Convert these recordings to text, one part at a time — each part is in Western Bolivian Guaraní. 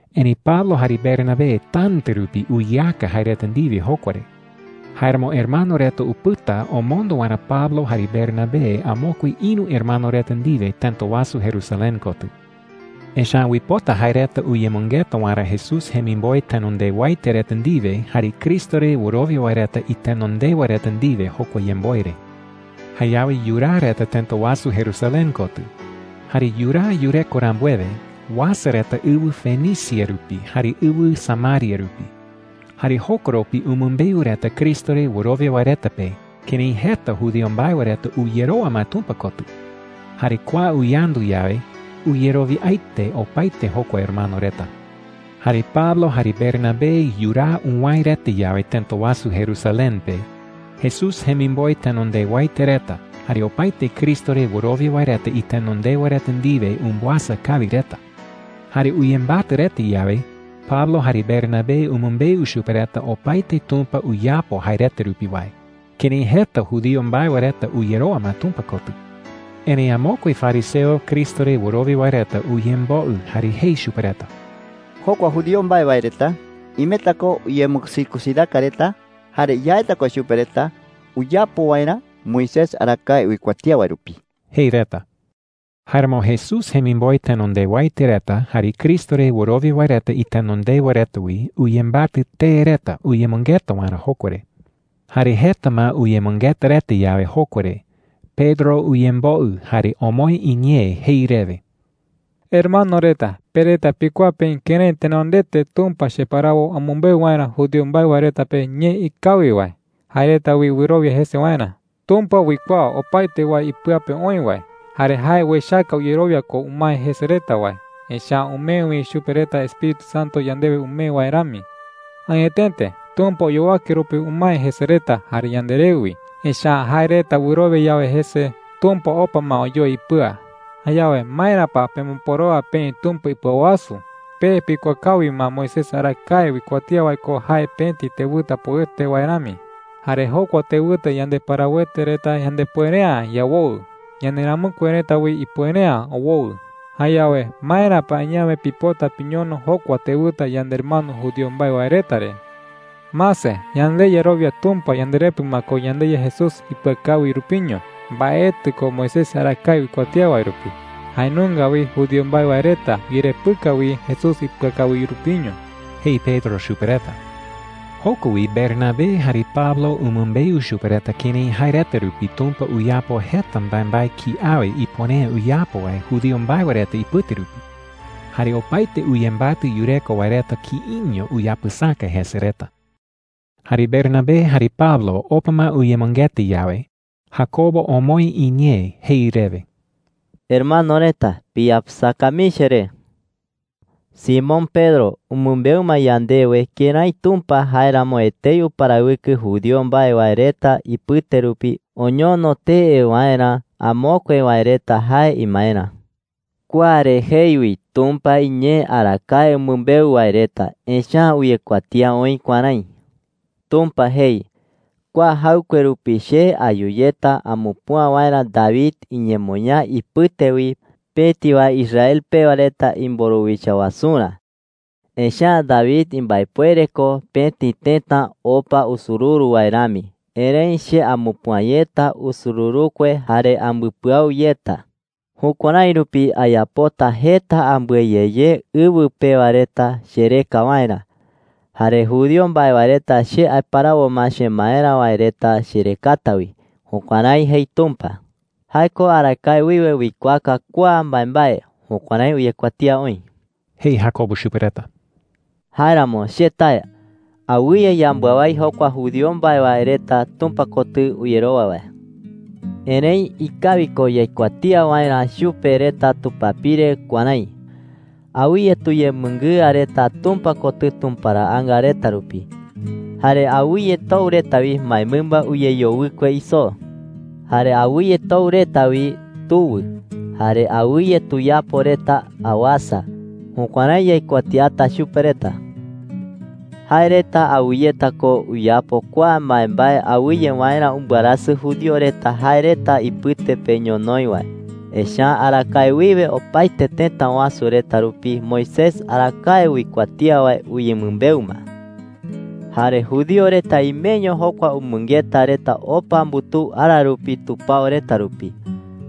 Erëi Pablo jare Bernabé täta rupi uyeaka jae reta ndiwe jokua re. Jáeramo hermano reta upɨta omondo waerä Pablo jare Bernabé amokue ïru hermano reta ndiwe tëta wasu Jerusalén kotɨ. Echa’ä uipota jae reta uyemɨngeta waerä Jesús jemimboe tenondewaete reta ndiwe jare Cristo re wɨrowia wae reta itenondewa reta ndiwe jokua yemboe re. Jayawe yuraa reta tëta wasu Jerusalén kotɨ. Jare yuraa yureko rambuewe, uasa reta ɨwɨ Fenicia rupi jare ɨwɨ Samaria rupi. Jare jokoropi umɨmbeu reta Cristo re wɨrowia wae reta pe kërái jeta judío mbae wae reta uyerowa ma Tumpa kotɨ. Jare kua uyandu yawe, uyerowiaete opaete jokua hermano reta. Jare Pablo jare Bernabé yuraa uwäe reta yawe tëta wasu Jerusalén pe, Jesús jemimboe tenondewaete reta jare opaete Cristo re wɨrowia wae reta itenondewa reta ndiwe umbɨasa kawi reta. Jare uyembatɨ reta yawe, Pablo jare Bernabé umɨmbeu chupe reta opaete Tumpa uyapo jae reta rupi wae, kërái jeta judío mbae wae reta uyerowa ma Tumpa kotɨ. Erëi amokue fariseo Cristo re wɨrowia wae reta uyemboɨ jare jei chupe reta: “Jokua judío mbae wae reta imeta ko uyembɨcircuncidaka reta, jare yaeta ko chupe reta uyapo waerä Moisés arakae uikuatía wae rupi,” jei reta. Jáeramo Jesús jemimboe tenondewaete reta jare Cristo re wɨrowia wae reta itenondewa reta wi uyembatɨ tee reta uyemɨngeta waerä jokua re. Jare jeta ma uyemɨngeta reta yawe jokua re, Pedro uyemboɨ jare omoë iñee jei rewe: “Hermano reta, pe reta pikuaa peï kërái tenondete Tumpa cheparawo amɨmbeu waerä judío mbae wae reta pe ñee ikawi wae, jae reta wi wɨrowia jese waerä,” jei. “Tumpa uikuaa opaete wae ipɨa pe oï wae. Jare jae uechaka uyerowia ko umae jese reta wae, echa’ä umee wi chupe reta Espíritu Santo yandewe umee wae rami,” jei. “Añetete Tumpa oyowake rupi umae jese reta jare yanderé wi. Echa’ä jae reta wɨrowia yawe jese, Tumpa opa ma oyoe ipɨa,” jei. “Jayawe, ¿maera pa pemboporowa peï Tumpa ipɨawasu? Pe pikuaa kawi ma Moisés arakae uikuatía wae ko jae pëti tewɨta poɨete wae rami. Jare jokua tewɨta yande parawete reta yandepuere’ä yawoɨ. Yanderamɨkue reta wi ipuere’ä owoɨ. Jayawe, ¿maera pa añawe pipota piñono jokua tewɨta yandehermano judío mbae wae reta re?” jei. “Mase, yande yarowia Tumpa yanderepɨ ma ko yandeYa Jesús ipɨakawi rupiño, mbaetɨ ko Moisés arakae uikuatía wae rupi. Jae nunga wi judío mbae wae reta uyerepɨka wi Jesús ipɨakawi rupiño,” jei Pedro chupe reta. Joko wi Bernabé jare Pablo umɨmbeu chupe reta kërái jae reta rupi Tumpa uyapo jeta mbaembae kiawe ipuere’ä uyapo wae judío mbae wae reta ipɨte rupi. Jare opaete uyembatɨ yureko wae reta kïiño uyapɨsaka jese reta. Jare Bernabé jare Pablo opa ma uyemɨngeta yawe, Jacobo omoë iñee jei rewe: “Hermano reta, piyapɨsaka mii cheré,” jei. “Simón Pedro umɨmbeu ma yandewe kërái Tumpa jaeramo etei uparawɨkɨ judío mbae wae reta ipɨte rupi oñono tee waerä amokue wae reta jae imaerä,” jei. “Kua re jei wi Tumpa iñee arakae umɨmbeu wae reta. Echa’ä uyekuatía oï kuärái: ‘Tumpa jei: ‘Kua jaɨkue rupi che ayu yeta amupüa waerä David iñemoñaa ipɨte wi pëti wae Israel pewa reta imburuwicha wasurä. Echa’ä David imbaepuere ko pëti tëta opa usururu wae rami. Erëi che amupüa yeta usururukue, jare ambɨpɨau yeta. Jukuärái rupi ayapota jeta ambɨe ye ye ɨwɨ pewa reta chereka waerä. Jare judío mbae wae reta che aiparawo ma chemaerä wae reta cherekata wi.’ Jukuärái jei Tumpa. Jae ko arakae wiwe uikuaaka kua mbaembae.’ Jukuärái uyekuatía oï,” jei Jacobo chupe reta. “Jáeramo che tae awɨye yambɨawái jokua judío mbae wae reta Tumpa kotɨ uyerowa wae. Erëi ikawi ko yaikuatía waerä chupe reta tupapire kuärái: ‘Awɨye tuyemɨngɨa reta Tumpa kotɨ tumparaanga reta rupi. Jare awɨye tou reta wi mbaemɨmba uyeyuwɨkue isoo, jare awɨye tou reta wi tuwɨ. Jare awɨye tuyapo reta awasa.’ Jukuärái yaikuatiata chupe reta,” jei. “Jae reta awɨyeta ko uyapo kua mbaembae awɨye waerä umbɨarasɨ judío reta jae reta ipɨte pe ñonoï wae. Echa’ä arakae wiwe opaete tëta wasu reta rupi Moisés arakae uikuatía wae uyemɨmbeu ma. Jare judío reta imeño jokua umɨngeta reta opa mbutuu ara rupi tupao reta rupi.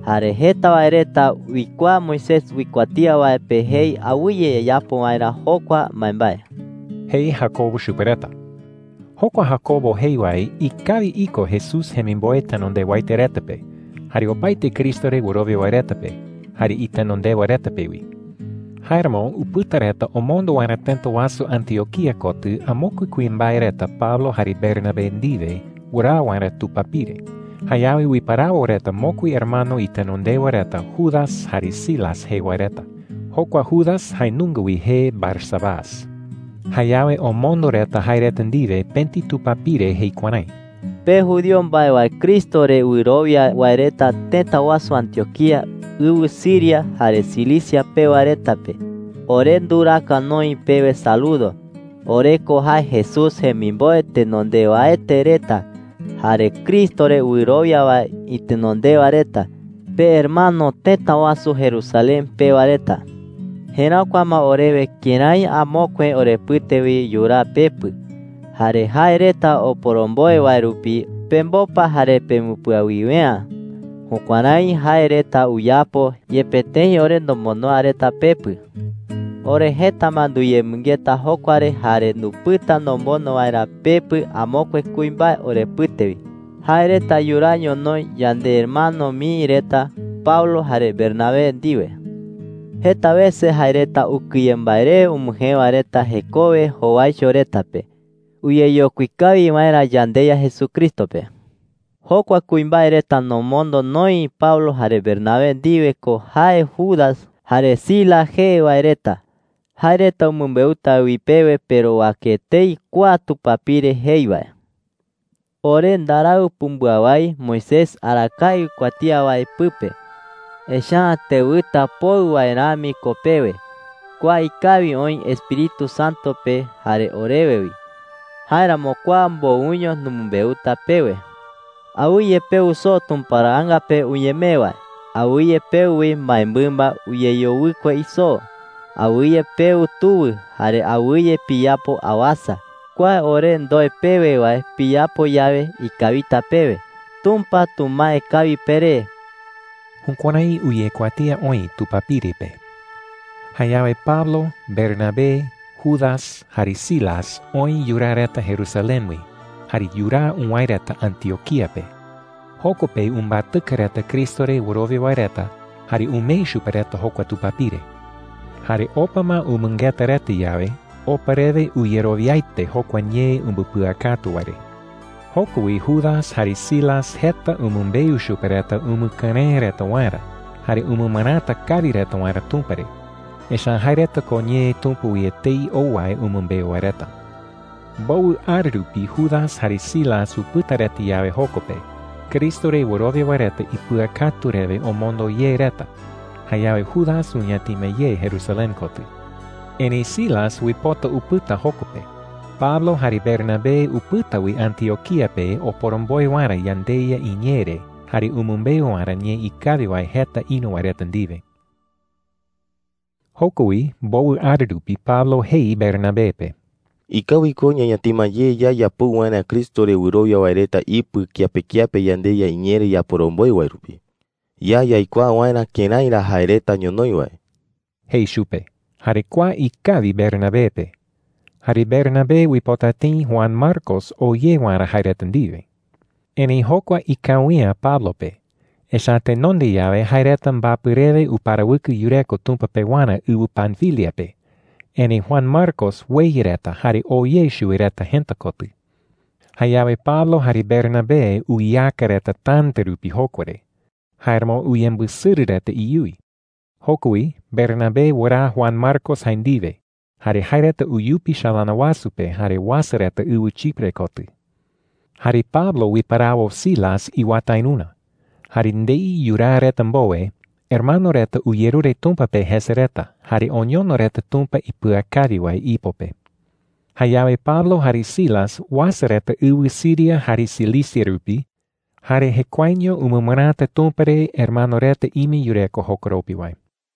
Jare jeta wae reta uikuaa Moisés uikuatía wae pe jei awɨye yayapo waerä jokua mbaembae,” jei Jacobo chupe reta. Jokua Jacobo jei wae ikawi iko Jesús jemimboe tenondewaete reta pe, jare opaete Cristo re wɨrowia wae reta pe, jare itenondewa reta pe wi. Jáeramo upɨta reta omondo waerä tëta wasu Antioquía kotɨ amokue kuimbae reta Pablo jare Bernabé ndiwe wɨraa waerä tupapire. Jayawe uiparawo reta mokui hermano itenondewa reta Judas jare Silas jee wae reta. Jokua Judas jae nunga wi jee Barsabás. Jayawe omondo reta jae reta ndiwe pëti tupapire jei kuärái: Pe judío mbae wae Cristo re wɨrowia wae reta tëta wasu Antioquía, ɨwɨ Siria jare Cilicia pewa reta pe, ore nduraaka noï pewe saludo. Ore ko jae Jesús jemimboe tenondewaete reta, jare Cristo re wɨrowia wae itenondewa reta – pehermano tëta wasu Jerusalén pewa reta. Jeräkua ma orewe kërái amokue orepɨte wi yuraa pepɨ. Jare jae reta oporomboe wae rupi pembopa jare pembɨpɨawiwe’ä. Jukuärái jae reta uyapo, yepe tëi ore nomondo’ä reta pepɨ. Ore jeta ma nduyemɨngeta jokua re jare ndupɨta nomondo waerä pepɨ amokue kuimbae orepɨte wi. Jae reta yuraa ñonoï yandehermano mii reta Pablo jare Bernabé ndiwe. Jeta wese jae reta ukɨye mbae rewe umɨjëwa reta jekowe jowaicho reta pe uyeyokui kawi waerä yandeYa Jesucristo pe. Jokua kuimbae reta nomondo noï Pablo jare Bernabé ndiwe ko jae Judas jare Silas jee wae reta. Jae reta umɨmbeuta wi pewe perowake etei kua tupapire jei wae. Ore ndarau pumbɨawái Moisés arakae uikuatía wae pɨpe, echa’ä tewɨta poɨ wae rami ko pewe. Kua ikawi oï Espíritu Santo pe jare orewe wi. Jáeramo kua mbowɨño numɨmbeuta pewe: Awɨye peu soo tumparaanga pe uñemee wae. Awɨye peu wi mbaemɨmba uyeyuwɨkue isoo. Awɨye peu tuwɨ. Jare awɨye piyapo awasa. Kua ore ndoe pewe wae piyapo yawe, ikawita pewe. Tumpa tumae kawi peré. Jukuärái uyekuatía oï tupapire pe. Jayawe Pablo, Bernabé, Judas, jare Silas oë yuraa reta Jerusalén wi jare yuraa uwäe reta Antioquía pe. Joko pe umbatɨka reta Cristo re wɨrowia wae reta jare umee chupe reta jokua tupapire. Jare opa ma umɨngeta reta yawe, opa rewe uyerowiaete jokua ñee umbɨpɨakatu wae re. Joko wi Judas jare Silas jeta umɨmbeu chupe reta umɨkɨrëɨ reta waerä jare umɨmɨräta kawi reta waerä Tumpa re. Echa’ä jae reta ko ñee Tumpa wi etei ou wae umɨmbeu wae reta. Mbowɨ ara rupi Judas jare Silas upɨta reta yawe joko pe, Cristo re wɨrowia wae reta ipɨakatu rewe omondo ye reta. Jayawe Judas uñatima ye Jerusalén kotɨ. Erëi Silas uipota upɨta joko pe. Pablo jare Bernabé upɨta wi Antioquía pe oporomboe waerä yandeYa iñee re jare umɨmbeu waerä ñee ikawi wae jeta ïru wae reta ndiwe. Joko wi mbowɨ ara rupi Pablo jei Bernabé pe: “Ikawi ko ñañatima ye ya yapou waerä Cristo re wɨrowia wae reta ipɨ kiape kiape yandeYa iñee re yaporomboe wae rupi. Ya yaikuaa waerä kërái ra jae reta ñonoï wae,” jei chupe. Jare kua ikawi Bernabé pe. Jare Bernabé uipota tëi Juan Marcos oo ye waerä jae reta ndiwe. Erëi jokua ikawi’ä Pablo pe. Echa’ä tenonde yawe, jae reta mbapɨ rewe uparawɨkɨ yureko Tumpa pewarä ɨwɨ Panfilia pe. Erëi Juan Marcos ueya reta jare oo ye chuwi reta jëta kotɨ. Jayawe Pablo jare Bernabé uyeaka reta täta rupi jokua re. Jáeramo uyembɨsɨrɨ reta iyuwi. Joko wi Bernabé wɨraa Juan Marcos jae ndiwe, jare jae reta uyupi chalana wasu pe jare uasa reta ɨwɨ Chipre kotɨ. Jare Pablo uiparawo Silas iwataïrurä. Jare ndei yuraa reta mbowe, hermano reta uyerure Tumpa pe jese reta jare oñono reta Tumpa ipɨakawi wae ipo pe. Jayawe Pablo jare Silas uasa reta ɨwɨ Siria jare Cilicia rupi, jare jekuaeño umɨmɨräta Tumpa re hermano reta ime yureko jokoropi wae.